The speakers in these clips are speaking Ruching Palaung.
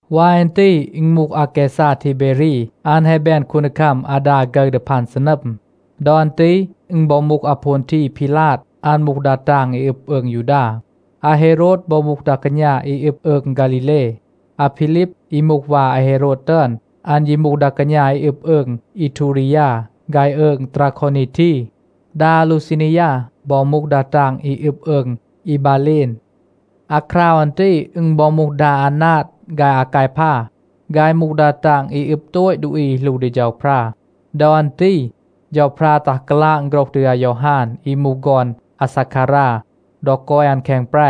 วาย อัน ตี อึณ มูห อาแกซา ทีเบรี, อัน แฮะ แบน คูนดีคัม อาดา ฆึร ดี พัน ซีนัม. ดอ อัน ตี อึณ บอ มูห อาโพนที พีลาด. อัน มูห ดา ตาง อี อึบ อืง ยูดา. อาเฮโรด บอ มูห ดา กาณา อี อึบ อืง ฆาลีเล. อาพีลีบ, อี มูห วา อาเฮโรด ตึอน, อัน ยี มูห ดา กาณา อี อึบ อืง อีทูรียา ฆาย อืง ตราโควนีที. ดา อาลูซานียา บอ มูห ดา ตาง อี อึบ อืง อีบาเลน. อาคราว อัน ตี, อึณ บอ มูห ดา อานาด ฆาย อากายพา, ฆาย มูห ดา ตาง อี อึบ โตต ดูอี อี หลู ดี เฌาพรา. ดอ อัน ตี เฌาพรา ตัห กาลาง โฆรห ดี อายอฮาน อี มูห ฆอน อาซาคารา ดอ กอย อัน แคง แปร.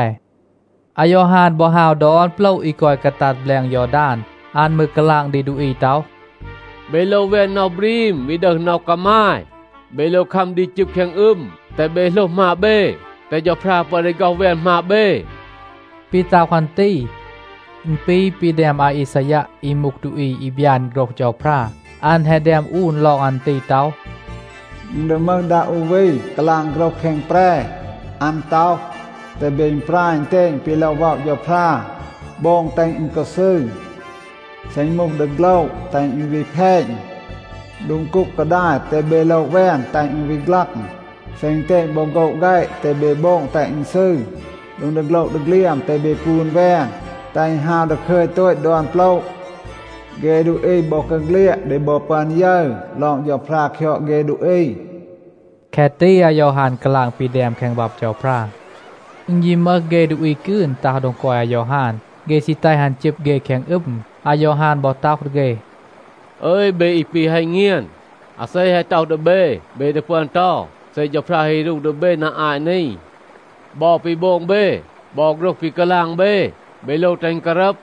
อายอฮาน บอ ฮาว ดอน โปละ อี กอย กาตัด แบลง ยอดาน. อัน มืร กาลาง ดี ดูอี ต็อห, “เบ โลว แวน น็อห บรีม, วี ดึห น็อห กามาย. เบ โลว คัม ดี จึบ แคง อึม, แตห เบ โหลห หมาบ เบ, แตห เฌาพรา ปึอน ดี ฆ็อห แวน หมาบ เบ.” ปี ต็อห อัน ตี, อึณ ปี ปี แดม อาอีซายัะ, อี มูห ดูอี อี บยาน โฆรห เฌาพรา. อัน แฮะ แดม อูน ลอง อัน ตี ต็อห, “อึณ ดี มึห ดา อู วี กาลาง โฆรห แคง แปร. อัน ต็อห, ‘แตห เบ อึณปราย อึณเตณ ปี โลว ว็อะ เฌาพรา. โบง, แตห อึณ กอ ซืร. เซ อึณ มูห ดีโฆละ, แตห อึณ วี แพณ. โดง กูก กาดาย, แตห เบ โละ แวน, แตห อึณ วี ฆลัง. เซ อึณเตณ บอ โฆะ แฆะ, แตห เบ โบง แตห อึณ ซืร. โดง ดีโฆละ ดีเฆลียม, แตห เบ ปูน แวน, แตห อึณ ฮาว ดาคึย โตต ดอน โปละ. เฆ ดูอี บอกาเฆลียด ดี บอ ปึอน ยึร ลอง เฌาพรา คยอด เฆ ดูอี.’” แคะ ตี อายอฮาน กาลาง ปี แดม แคง บับ เฌาพรา. อึณ ยี มึห เฆ ดูอี กืน ตัห โดง กอย อายอฮาน. เฆ ซี แตห อัน จึบ เฆ แคง อึม. อายอฮาน บอ ต็อห ดี เฆ, “อึย, เบ อี ปี ฮัณ เงียน. อาเซ แฮะ ต็อห ดี เบ, เบ ดี ปึอน เตา เซ เฌาพรา ฮี รู ดี เบ นา อาต นี? บอ ปี โบง เบ, บอ โฆรห ปี กาลาง เบ, เบ โลว แตห อึณ การัม.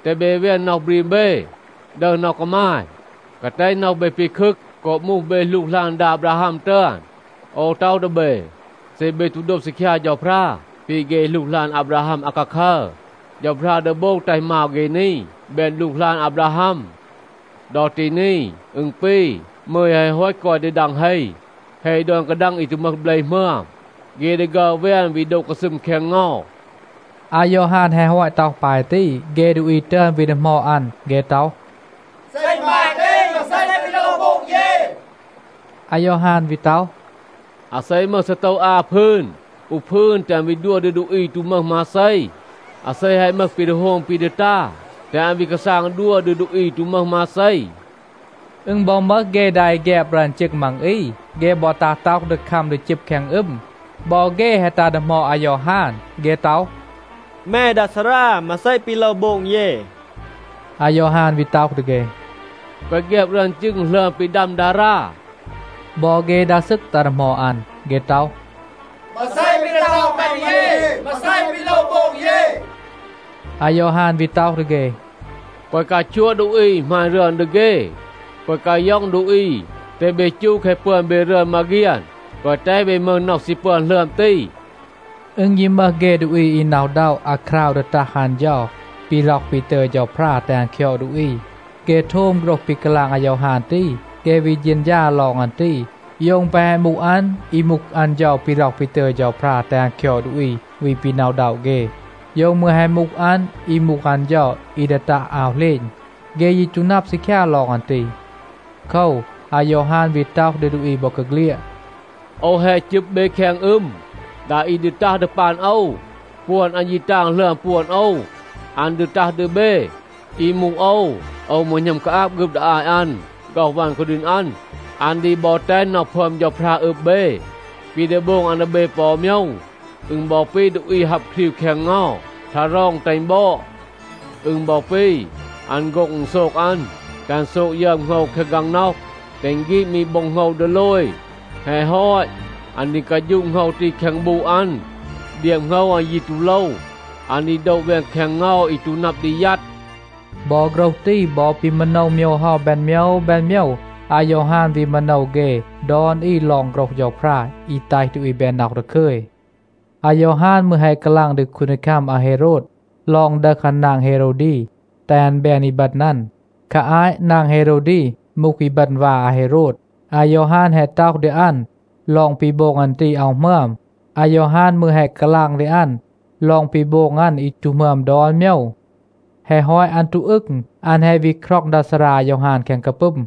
แตห เบ แวน น็อห บรีม เบ, ดึห น็อห กามาย. แกวะ แตห น็อห เบ ปีคึก โกบ มูห เบ หลูกหลาน ดา อาบราฮัม ตึอน. โอว ต็อห ดี เบ, เซ เบ ตู โดบ ซีคยา เฌาพรา ปี เฆ หลูกหลาน อาบราฮัม อาคาคัร, เฌาพรา ดี โบง แตห มาว เฆ นี แบน หลูกหลาน อาบราฮัม. ดอ ตี นี อึณ ปี มึย แฮะ ฮอต กอย ดี ดัง เฮ. เฮ ดอน กาดัง อี ตู มึห เบล หมึอม, เฆ ดี ฆัร แวน วี โดะ กาซึม แคง เงา.” อายอฮาน แฮะ ฮอต ต็อห ปาย ตี, เฆ ดูอี ตึอน วี ดีหมอด อัน. เฆ ต็อห, “เซ อึณ ปาย ตี, มาเซ ปี ดี โลว โบง เย?” อายอฮาน วี ต็อห, “อาเซ มึห ซีโตว อา พืน, อู พืน แตห อัน วี ดัว ดี ดูอี อี ตู มึห มาเซ. อาเซ แฮะ มึห ปี ดี โฮม ปี ดี ตา, แตห อัน วี กาซาง ดัว ดี ดูอี อี ตู มึห มาเซ.” อึณ บอ มึห เฆ ดา อี แฆบ รึอน จึง มัง อี, เฆ บอ ตัห ต็อห ดี คัม ดี จึบ แคง อึม. บอ เฆ แฮะ ตัห ดีหมอด อายอฮาน. เฆ ต็อห, “แม ดา ซารา, มาเซ ปี โลว โบง เย?” อายอฮาน วี ต็อห ดี เฆ, “แกวะ แฆบ รึอน จึง หลึอม ปี ดัม ดารา.” บอ เฆ ดา ซึก ตัห ดีหมอด อัน. เฆ ต็อห, “มาเซ ปี ดี ต็อห แม ดี เย? มาเซ ปี โลว โบง เย?” อายอฮาน วี ต็อห ดี เฆ, “แกวะ กาชัวะ ดูอี, หมาณ รึอน ดี เฆ. แกวะ กาย็อง ดูอี. แตห เบ จู แคะ ปึอน เบ รึอน มาเฆียน. แกวะ แตห เบ มึห น็อห ซี ปึอน หลึอม ตี.” อึณ ยี มึห เฆ ดูอี อี หน็อะ อึณด็อะ อาคราว ดี ตัห อัน เฌา ปี ร็อห ปี ตึย เฌาพรา แตห อัน คยอด ดูอี. เฆ โทม โฆรห ปี กาลาง อายอฮาน ตี, เฆ วี เฌณฌา ลอง อัน ตี, โยว อึณ แปะ แฮะ มูห อัน อี มูห อัน เฌา ปี ร็อห ปี ตึย เฌาพรา แตห อัน คยอด ดูอี, วี ปี หน็อะ อึณด็อะ เฆ. โยว มืร แฮะ มูห อัน อี มูห อัน เฌา อี ดี ตัห อาว เหลณ. เฆ ยี ตู นับ ซีคยา ลอง อัน ตี. โคว, อายอฮาน วี ต็อห ดี ดูอี บอกาเฆลียด, “โอว แฮะ จึบ เบ แคง อึม. ดา อี ดี ตัห ดี ปัน โอว, ปวน อัน ยี ตาง หลึอม ปวน โอว. อัน ดี ตัห ดี เบ. อี มูห โอว, โอว มืร หณัม กาอาบ ฆึบ ดี อาต อัน, ฆ็อห วัน คูดีณ อัน. อัน ดี บอ แตห น็อห พึอม เฌาพรา อึบ เบ. ปี ดี โบง อัน ดี เบ ปอ อู โมยว, อึณ บอ ปี ดูอี ฮับ ครีว แคง เงา, ทารอง แตห อึณ บอด. อึณ บอ ปี, อัน โฆ็ง อึณโซก อัน, แตห อัน โซก ยึอม โหงว แคง กางน็อห, แตห อึณ ฆีด มี โบ็ง โหงว ดีโลย. แฮะ ฮอต, อัน ดี กาฌูะ โหงว ตี แคง บูะ อัน. เดียบ โหงว อัน ยี ตู โลว. อัน ดี โดะ แวน แคง เงา อี ตู นับ ดี ยัด.” บอ โฆรห ตี บอ ปี มาโนว โมยว เฮา แบน โมยว แบน โมยว, อายอฮาน วี มาโนว เฆ ดอน อี ลอง โฆรห เฌาพรา อี แตห ดูอี แบน น็อห ดาคึย. อายอฮาน มืร แฮะ กาลาง ดี คูนดีคัม อาเฮโรด ลอง ดึห อัน นาง เฮโรวดี, แตห อัน แบน อีบึณ อัน. คา อาต นาง เฮโรวดี มูห อีบึณ วา อาเฮโรด. อายอฮาน แฮะ ต็อห ดี อัน ลอง ปี โบง อัน ตี อาว หมึอม. อายอฮาน มืร แฮะ กาลาง ดี อัน ลอง ปี โบง อัน อี ตู หมึอม ดอน โมยว. แฮะ ฮอต อัน ตู อึง, อัน แฮะ วี คร็อง ดา ซารา อายอฮาน แคง กาปึม.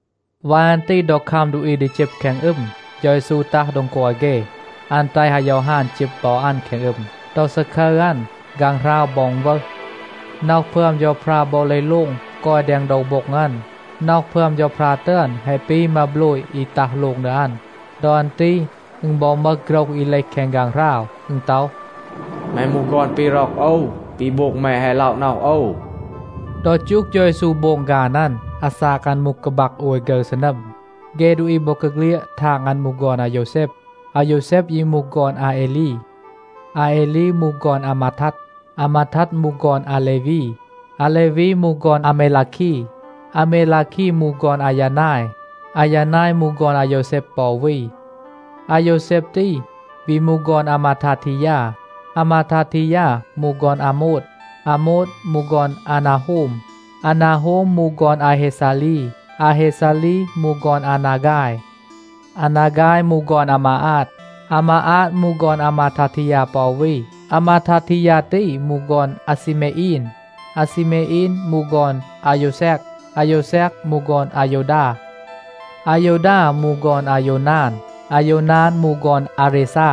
วาย อัน ตี ดอ คัม ดูอี ดี จึบ แคง อึม, เฌา เยซู ตัห โดง กอย เฆ. อัน แตห อายอฮาน จึบ บอ อัน แคง อึม. ดอ ซาคึร อัน, ฆางหราว บอ อึณวึห. น็อห พึอม เฌาพรา บอ เลห โลง กอย แดง โดว โบ็ง อัน. น็อห พึอม เฌาพรา ตึอน แฮะ ปี มาโบลย อี ตัห โลง ดี อัน. ดอ อัน ตี อึณ บอ มึห โฆรห อี เลห แคง ฆางหราว. อึณ ต็อห, “แม มูห ฆอน ปี ร็อก โอว. ปี โบง แม แฮะ ล็อะ น็อห โอว.” ดอ จูห เฌา เยซู โบง ฆาน อัน, อาซาก อัน มูห กาบัก โอย ฆึร ซีนัม. เฆ ดูอี บอกาเฆลียด ทาง อัน มูห ฆอน อาโยวแซบ. อาโยวแซบ ยี มูห ฆอน อาเอลี. อาเอลี มูห ฆอน อามาทัด. อามาทัด มูห ฆอน อาเลวี. อาเลวี มูห ฆอน อาเมลาคี. อาเมลาคี มูห ฆอน อายานาย. อายานาย มูห ฆอน อาโยวแซบ ปอ วี. อาโยวแซบ ตี วี มูห ฆอน อามาทาทียา. อามาทาทียา มูห ฆอน อาโมด. อาโมด มูห ฆอน อานาโฮม. อานาโฮม มูห ฆอน อาเฮซาลี. อาเฮซาลี มูห ฆอน อานาฆาย. อานาฆาย มูห ฆอน อามาอาด. อามาอาด มูห ฆอน อามาทาทียา ปอ วี. อามาทาทียา ตี มูห ฆอน อาเซเมอีน. อาเซเมอีน มูห ฆอน อาโยวเซก. อาโยวเซก มูห ฆอน อาโยวดา. อาโยวดา มูห ฆอน อาโยวนาน. อาโยวนาน มูห ฆอน อาเรซา.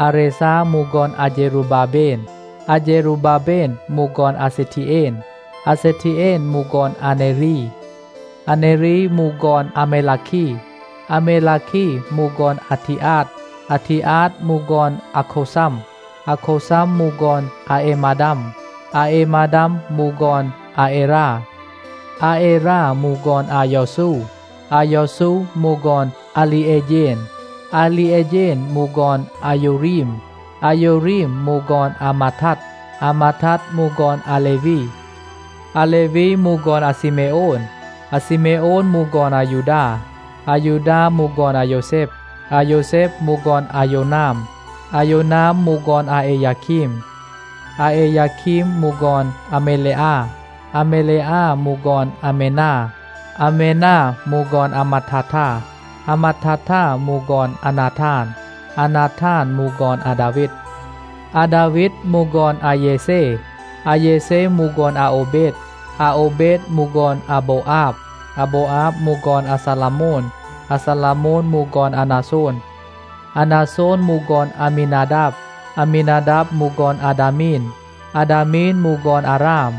อาเรซา มูห ฆอน อาเฌรูบาเบน. อาเฌรูบาเบน มูห ฆอน อาเซทีเอน. อาเซทีเอน มูห ฆอน อาเนรี. อาเนรี มูห ฆอน อาเมลาคี. อาเมลาคี มูห ฆอน อาทีอาด. อาทีอาด มูห ฆอน อาโควซัม. อาโควซัม มูห ฆอน อาเอมาดัม. อาเอมาดัม มูห ฆอน อาเอรา. อาเอรา มูห ฆอน อายอซู. อายอซู มูห ฆอน อาลีเอเฌน. อาลีเอเฌน มูห ฆอน อาโยวรีม. อาโยวรีม มูห ฆอน อามาทัด. อามาทัด มูห ฆอน อาเลวี. อาเลวี มูห ฆอน อาซีเมโอน. อาซีเมโอน มูห ฆอน อายูดา. อายูดา มูห ฆอน อาโยวแซบ. อาโยวแซบ มูห ฆอน อาโยวนาม. อาโยวนาม มูห ฆอน อาเอยาคีม. อาเอยาคีม มูห ฆอน อาเมเลอา. อาเมเลอา มูห ฆอน อาเมนา. อาเมนา มูห ฆอน อามัดทาทา. อามัดทาทา มูห ฆอน อานาทาน. อานาทาน มูห ฆอน อาดาวีด. อาดาวีด มูห ฆอน อาเยเซ. อาเยเซ มูห ฆอน อาโอวเบด. อาโอวเบด มูห ฆอน อาโบวอาบ. อาโบวอาบ มูห ฆอน อาซาลาโมน. อาซาลาโมน มูห ฆอน อานาโซน. อานาโซน มูห ฆอน อามีนาดาบ. อามีนาดาบ มูห ฆอน อาดามีน. อาดามีน มูห ฆอน อาราม.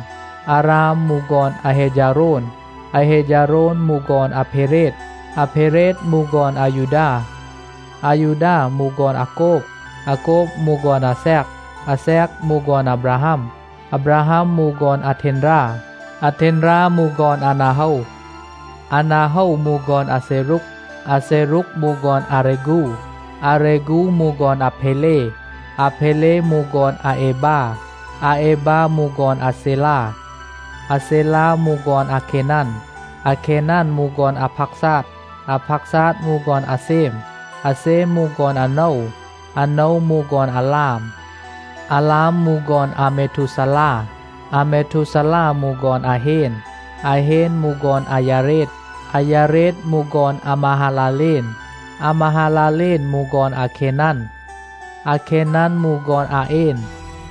อาราม มูห ฆอน อาเฮฌาโรน. อาเฮฌาโรน มูห ฆอน อาเพเรด. อาเพเรด มูห ฆอน อายูดา. อายูดา มูห ฆอน อาโกบ. อาโกบ มูห ฆอน อาแซก. อาแซก มูห ฆอน อาบราฮัม. อาบราฮัม มูห ฆอน อาเทนรา. อาเทนรา มูห ฆอน อานาโฮว. อานาโฮว มูห ฆอน อาเซรูก. อาเซรูก มูห ฆอน อาเรฆู. อาเรฆู มูห ฆอน อาเพเล. อาเพเล มูห ฆอน อาเอบา. อาเอบา มูห ฆอน อาเซลา. อาเซลา มูห ฆอน อาเคนัน. อาเคนัน มูห ฆอน อาพาซาด. อาพาซาด มูห ฆอน อาเซม. อาเซม มูห ฆอน อาโนว. อาโนว มูห ฆอน อาลาม. อาลาม มูห ฆอน อาเมทูซาลา. อาเมทูซาลา มูห ฆอน อาเฮน. อาเฮน มูห ฆอน อายาเรด. อายาเรด มูห ฆอน อามาฮาลาเลน. อามาฮาลาเลน มูห ฆอน อาเคนัน. อาเคนัน มูห ฆอน อาเอน.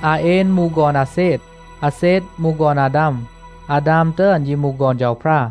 อาเอน มูห ฆอน อาเซด. อาเซด มูห ฆอน อาดาม. อาดาม ตึอน ยี มูห ฆอน เฌาพรา.